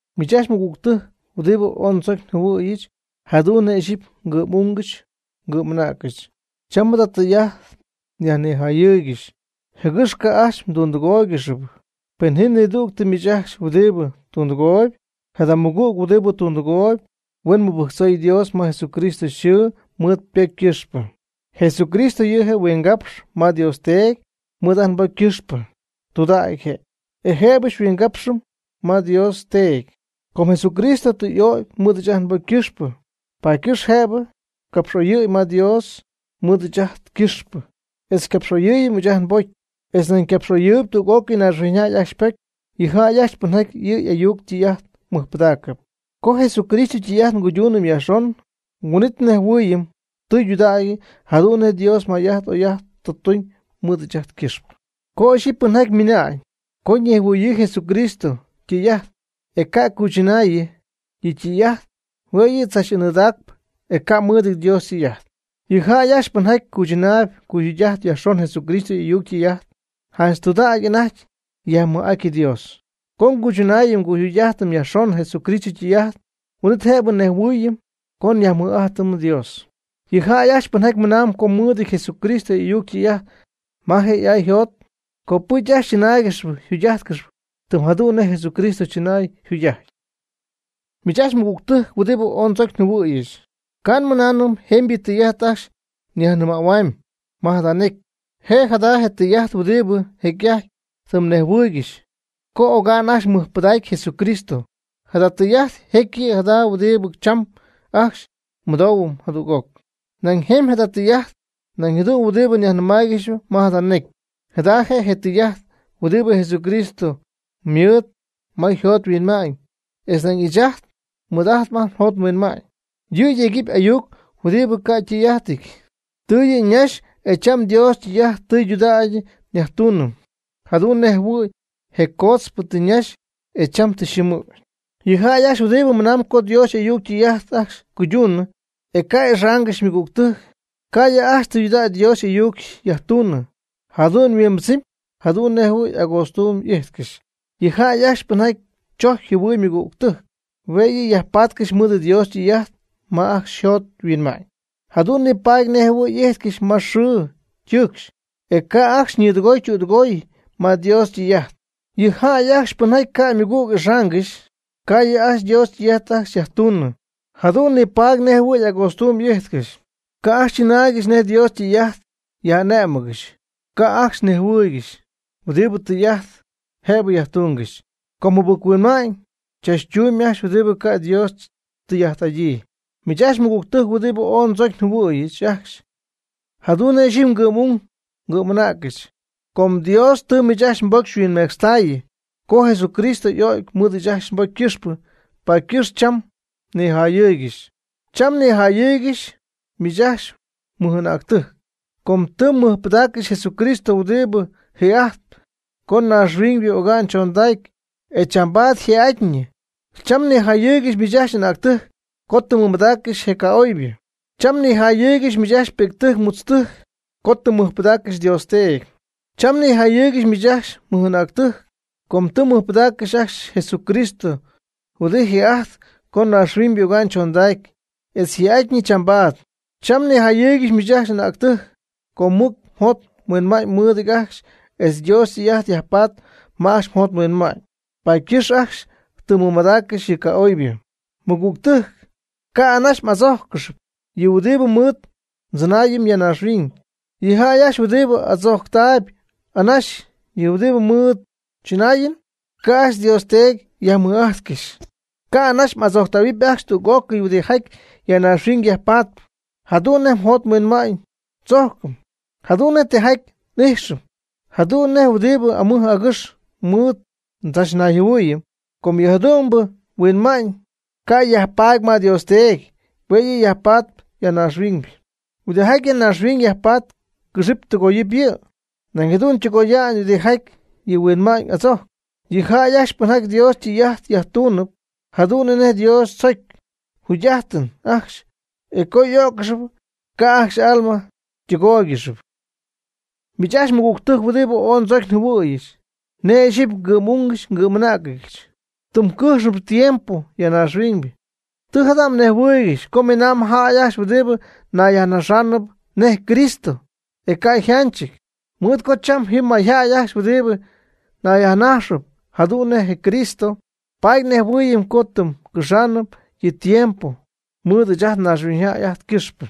Miich ajcxy mɨgügtɨjc huɨdibɨ ooy ndzocy njɨhuɨ̈yɨch jadu'n nej ixyipy ngɨ'm'ungɨch ngɨ'm'anäcɨch, cham jada tɨy'ajt nyajnijayɨɨygɨxy, jɨgɨx ca' ajcxy mdundɨgóoygɨxɨpy. Pen ji nidügtɨ miich ajcxy huɨdibɨ tundɨgooyb, jada mɨgüg huɨdibɨ tundɨgooyb huen mɨbɨjctzoy Dios ma Jesucristo yxɨɨ mɨɨd ypocy ycɨxpɨ. Jesucristo yɨ'je' huingapxp ma Dios Teedy mɨɨd ajt nbocy ycɨxpɨ. Tudägy je', e jëbɨ xyhuingapxɨm ma Dios Teedy. Com Jesucristo tɨ y'ögy mɨɨd ɨɨch ajt nbocy ycɨxpɨ, paady ycɨxp jëbɨ capx'oyɨ̈y ma Dios mɨɨd ɨɨch ajt ycɨxpɨ e xycapx'oyɨɨyɨm ɨɨch ajt nbocy etz nañ capx'oyɨɨyɨp tüg'ócɨy naaxhuiñy jäy ajcxy ypocy, yɨ jäy ajcxy pɨnjaty yɨ' y'ayuc ytɨy'ajt mɨjpɨdaacɨp. Co Jesucristo ytɨy'ajt nguyduunɨm yajxon, huin'it nejhuɨɨyɨm tɨydudägy jadu'n nej Dios may'ajt oy'ajt tɨ tuñ mɨɨd ɨɨch ajt ycɨxpɨ. Co ixyipy pɨnjaty ymɨna'ñ co ñejhuɨɨyɨ Jesucristo ytɨy'ajt e ca' cuychɨnaayɨ yɨ' ytɨy'ajt hue' yɨ' tzach anɨɨdaacpɨ, e ca' mɨɨdɨty Dios ytɨy'ajt. Yɨ jäy ajcxy pɨnjaty cuychɨnaayb cuyjugy'ajtp yajxon Jesucristo y'ayuc ytɨy'ajt, janch tɨydudägy anajty yajmɨj'aty Dios. Co nguychɨnaayɨm nguyjugy'ajtɨm yajxon Jesucristo ytɨy'ajt, huin'it jëbɨ nejhuɨɨyɨm co nyajmɨj'ajtɨm Dios. Yɨ jäy ajcxy pɨnjaty mɨnamb co ymɨɨd Jesucristo y'ayuc ytɨy'ajt ma je' y'ay yjot, copɨcy ajcxy chɨnáaygɨxyɨpy jugy'ájtcɨxɨpy tɨm jadu'n nej Jesucristo chɨnay jugy'ajty. Miich ajcxy mɨgügtɨjc huɨdibɨ ooy ndzocy njɨhuɨ̈yɨch, ca' nmɨnaanɨm jemybɨ tɨy'ajt ajcxy nyajnɨmähuamy ma jada necy. Je' jada je tɨy'ajt huɨdibɨ jecy'ajty tɨ mnejhuɨɨygɨxy co oga'n ajcxy mmɨjpɨdacy Jesucristo. Jada tɨy'ajt jecyɨp jada je' huɨdibɨ cham ajcxy mmɨdooyb jadüg'oc. Nañ jemy jada tɨy'ajt nañ jadu'n huɨdibɨ nyajnɨmaaygɨxyp ma jada necy. Jada je'je tɨy'ajt huɨdibɨ Jesucristo ymɨɨd ma yjot yhuinma'ñ etz nañ ɨɨch ajt nmɨɨd ma ajt njot nhuinma'ñ. Yɨ jecyɨp ayuc huɨdibɨ ca' ytɨy'ajtɨty, tɨ yɨ' ñaxy e cham Dios ytɨy'ajt tɨydudägy nyajtuunɨm, jadu'n nej jɨhuɨ̈y je coodzpɨ tɨ ñaxy e cham tɨ yxɨɨmɨ̈y. Yɨ jäy ajcxy huɨdibɨ mɨnam co Dios y'ayuc ytɨy'ajt ajcxy cuyduunɨ e ca' ixáanɨgɨxy ymɨgügtɨjc, ca' yɨ' ajcxy tɨydudägy Dios y'ayuc yajtuunɨ, jadu'n yhuimbɨdzɨmy jadu'n nej jɨhuɨ̈y agootztuuy ijtcɨxy. Yɨ jäy ajcxy pɨnjaty tzojcp jɨhuɨɨyb ymɨgügtɨjc hue' yɨ' yajpaatcɨxy mɨɨd Dios ytɨy'ajt ma ajcxy yjot yhuinma'ñ, jadu'n nipaady nej jɨhuɨ̈y y'ijtcɨxy ma xɨɨ ytɨɨcxy, ca' ajcxy ñɨɨdɨgoy ytüdɨgoy ma Dios ytɨy'ajt. Yɨ jäy ajcxy pɨnjaty ca' ymɨgüg ixaangɨxy, ca' yɨ' ajcxy Dios ytɨy'ajt ajcxy yajtuunɨ, jadu'n nipaady nej jɨhuɨ̈y agootztuuby y'ijtcɨxy, ca' ajcxy chɨnaaygɨxy nej Dios ytɨy'ajt yja'ané'mɨgɨxy, ca' ajcxy nejhuɨɨygɨxy huɨdibɨ tɨy'ajt jëbɨ yajtungɨxy, com jɨbɨc-huinma'ñ chachtuumyb ajcxy huɨdibɨ ca' Dios tɨy'ajt'adyii. Miich ajcxy mɨgügtɨjc huɨdibɨ ooy ndzocy njɨhuɨ̈yɨch ajcxy jadu'n nej ixyipy ngɨ'm'ung ngɨ'm'anäcɨch, com Dios tɨ miich ajcxy mbocy xyhuinmecxtayɨ co Jesucristo y'o'cy mɨɨd ajcxy mbocy ycɨxpɨ, paady ycɨxp cham nnijayɨɨygɨxy. Cham nnijayɨɨygɨxy miich ajcxy mɨj'anäctɨjc, com tɨ mmɨjpɨdaaccɨxy Jesucristo huɨdibɨ jii'ajt co naaxhuiñybɨ oga'n choondacy etz chambaad yjii'atyñɨ. Cham nnijayɨɨygɨxy miich ajcxy anäctɨjc, com tɨ mmɨmadaaccɨxy je ca'oybɨ. Cham nnijayɨɨygɨxy miich ajcxy pi'ctɨjc mutztɨjc com tɨ mmɨjpɨdaaccɨxy Dios Teedy. Cham nnijayɨɨygɨxy miich ajcxy mɨj'anäctɨjc, com tɨ mmɨjpɨdaaccɨxy ajcxy Jesucristo huɨdibɨ jii'ajt co naaxhuiñybɨ oga'n chondacy etz yjii'atyñɨ chambaad. Cham nnijayɨɨygɨxy miich ajcxy anäctɨjc, com mɨc mjot mhuinma'ñ mɨɨdɨty ajcxy etz Dios ytɨy'ajt yajpatp ma ajcxy mjot mhuinma'ñ, paady ycɨxp ajcxy tɨ mmɨmadaaccɨxy yɨ ca'oybɨ. Mɨgügtɨjc, ca' anaxy m'adzójccɨxɨp yɨ huɨdibɨ mɨɨd ndzɨnaayɨm ya naaxhuiñ. Yɨ jäy ajcxy huɨdibɨ adzojctaayb anaxy yɨ huɨdi mɨɨd ndzɨnaayɨm, ca' ajcxy Dios Teedy yajmɨj'ajtcɨxy. Ca' anaxy m'adzojctähuɨpy ajcxy tüg'ócɨy huɨdijaty ya naaxhuiñ yajpatp, jadu'n nej njot nhuinma'ñ tzojcɨm, jadu'n nej tijaty n'ijxɨm, jadu'n nej huɨdibɨ amɨj agɨx mɨɨd ndzachnayjɨhuɨɨyɨm. Com yɨ jadu'mbɨ huinma'ñ ca' yajpaady ma Dios Teedy, hue' yɨ' yajpaady ya naaxhuiñ. Huɨdijaty ya naaxhuiñ yajpatp cɨxɨpy tɨgoyɨpy yɨ', nañ jadu'n ytɨgoya'ñ huɨdijaty yɨ huinma'ñ y'adzojcpy. Yɨ jäy ajcxy pɨnjaty Dios ytɨy'ajt yajtuunɨp jadu'n nej Dios tzocy, jugy'adɨpy ajcxy e co y'ó'ccɨxɨpy, ca' ajcxy y'alma ytɨgóoygɨxɨpy. Miich ajcxy mɨgügtɨjc huɨdibɨ ooy ndzocy njɨhuɨ̈yɨch nej ixyipy ngɨ'm'ung ngɨ'm'anäcɨch, tɨm cɨjxnɨp tiempo ya naaxhuiñ. Tɨ jada mnejhuɨɨygɨxy co miinaam jäy ajcxy huɨdibɨ nayyajnaxaanɨp nej Cristo' e ca' yjanchɨty. Mɨɨd co cham ji mayjäy ajcxy huɨdibɨ nayyajnajxɨp jadu'n nej Cristo, paady nejhuɨɨyɨm co tɨm cɨjxnɨp yɨ tiempo mɨɨd ɨɨch naaxhuiñyjäy ajt ycɨxpɨ.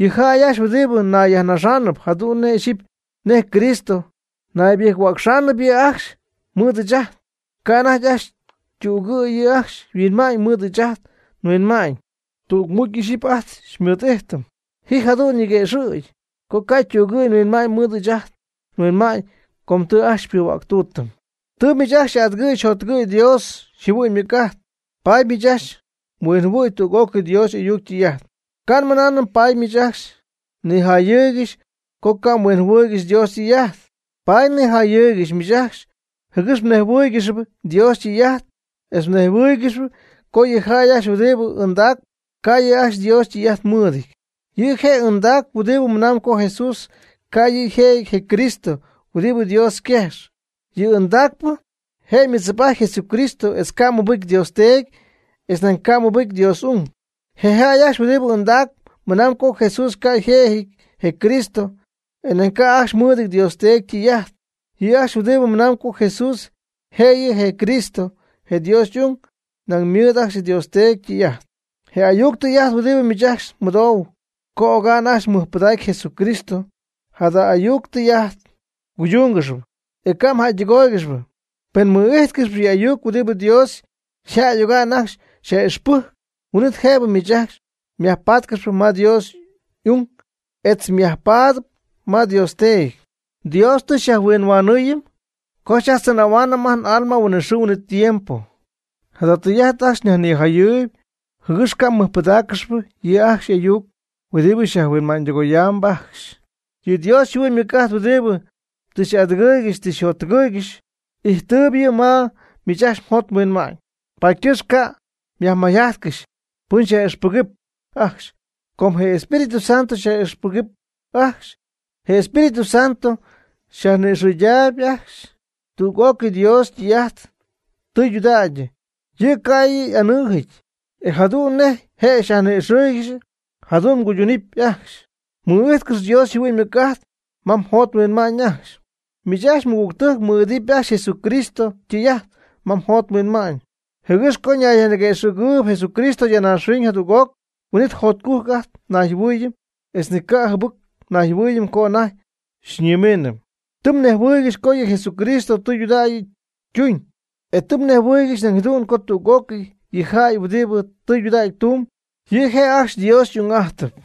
Yɨ jäy ajcxy huɨdibɨ nayyajnaxaanɨp jadu'n ixyipy nej Cristo, naybɨjc-huäcxaanɨp yɨ' ajcxy mɨɨd ɨɨch ajt, ca' anajty ajcxy ytügɨ̈y yɨ' ajcxy yhuinma'ñ mɨɨd ɨɨch ajt nhuinma'ñ, tügmucy ixyipy ajt xymɨɨd'ijtɨm. Ji jadu'n ñiguëxɨ̈gy co ca' ytügɨ̈y yhuinma'ñ mɨɨd ɨɨch ajt nhuinma'ñ co tɨ ajcxy xypuhuäctuutɨm. Tɨ miich ajcxy xy'adɨgɨ̈y xyjottɨgɨ̈y Dios yjɨhuɨ'ñ ymɨc'ajt, paady miich ajcxy mhuinjɨhuɨ̈y tüg'ócɨy Dios y'ayuc ytɨy'ajt. Ca' nmɨnaanɨm paady miich ajcxy nijayɨɨygɨxy co ca' mhuinjɨhuɨɨygɨxy Dios ytɨy'ajt. Paady nnijayɨɨygɨxy miich ajcxy jɨgɨx mnejhuɨ́ɨygɨxyɨp Dios ytɨy'ajt etz mnejhuɨ́ɨygɨxyɨp co yɨ jäy ajcxy huɨdibɨ ɨndaacp, ca' yɨ' ajcxy Dios ytɨy'ajt mɨɨdɨty. Yɨ' je' ɨndacp huɨdibɨ mɨnamb co Jesús ca' yɨ' yjëjɨty je Cristo huɨdibɨ Dios yquejx. Yɨ ɨndacpɨ je'mɨdzip'ajtp Jesucristo etz ca' mɨbɨcy Dios Teedy etz nañ ca' mɨbɨjcɨ Dios y'ung. Je jäy ajcxy huɨdibɨ ɨndacp mɨnam co Jesús ca' yjëjɨty je Cristo, e nañ ca' ajcxy mɨɨdɨty Dios Teedy ytɨy'ajt. Yɨ jäy ajcxy huɨdibɨ mɨnam co Jesús yjëjɨty je Cristo je Dios y'ung, nañ ymɨɨd ajcxy Dios Teedy ytɨy'ajt. Je ayuc tɨy'ajt huɨdibɨ miich ajcxy mmɨdou co oga'n ajcxy mmɨjpɨdacy Jesucristo, jada ayuc tɨy'ajt mguydúngɨxyɨpy e ca' mjäydɨgóoygɨxɨpy. Pen mmɨ'ijtcɨxp yɨ ayuc huɨdibɨ Dios yjäy oga'n ajcxy xyaj'ixpɨjc, huin'it jëbɨ miich ajcxy myajpatcɨxy ma Dios y'ung etz je' yajpaady ma Dios Teedy. Dios tɨ xyajhuinhuanɨɨyɨm co xyajtzɨnähuaanɨm ajt n'alma huinɨxɨɨ huinɨtiempo. Jada tɨy'ajt ajcxy nyajnijayɨɨyb jɨgɨx ca' mmɨjpɨdáaccɨxɨpy yɨ' ajcxy y'ayuc huɨdibɨ xyajhuinma'ñydɨgoyaam ajcxy. Yɨ Dios yjɨhuɨ'ñ ymɨc'ajt huɨdibɨ tɨ xy'adɨgɨɨygɨxy tɨ xyjottɨgɨɨygɨxy ijttɨɨb yɨ' ma miich ajcxy mjot mhuinma'ñ. Paady ycɨxp ca' myajmayjajtcɨxy pɨn xyaj'ixpɨgɨp ajcxy com je Espíritu Santo xyaj'ixpɨgɨp ajcxy. Je Espíritu Santo xyajni'ixɨydaayb ajcxy tüg'ócɨy Dios ytɨy'ajt, tɨydudägy yɨ', ca' yɨ' y'anɨɨjɨty. E jadu'n nej je' xyajni'ixɨɨygɨxy, jadu'n mguydunɨpy ajcxy. Mɨ'ijtcɨx Dios yjɨhuɨ'ñ ymɨc'ajt ma mjot mhuinma'ñ ajcxy. Miich ajcxy mɨgügtɨjc, mɨ'idɨpy ajcxy Jesucristo ytɨy'ajt ma mjot mhuinma'ñ jɨgɨx co ñayyajniguëxɨ̈gɨɨyb Jesucristo ya naaxhuiñ jadüg'oc, huin'it jotcujc ajt nnayjɨhuɨɨyɨm etz ni ca' jɨbɨc nayjɨhuɨɨyɨm co anajty xyñimiinɨm. Tɨ mnejhuɨɨygɨxy co yɨ Jesucristo tɨydudägy ytuñ, e tɨ mnejhuɨɨygɨxy nañ jadu'n co tüg'ócɨy yɨ jäy huɨdibɨ tɨydudägy tumb, yɨ' je' ajcxy Dios y'ung'ajtɨp.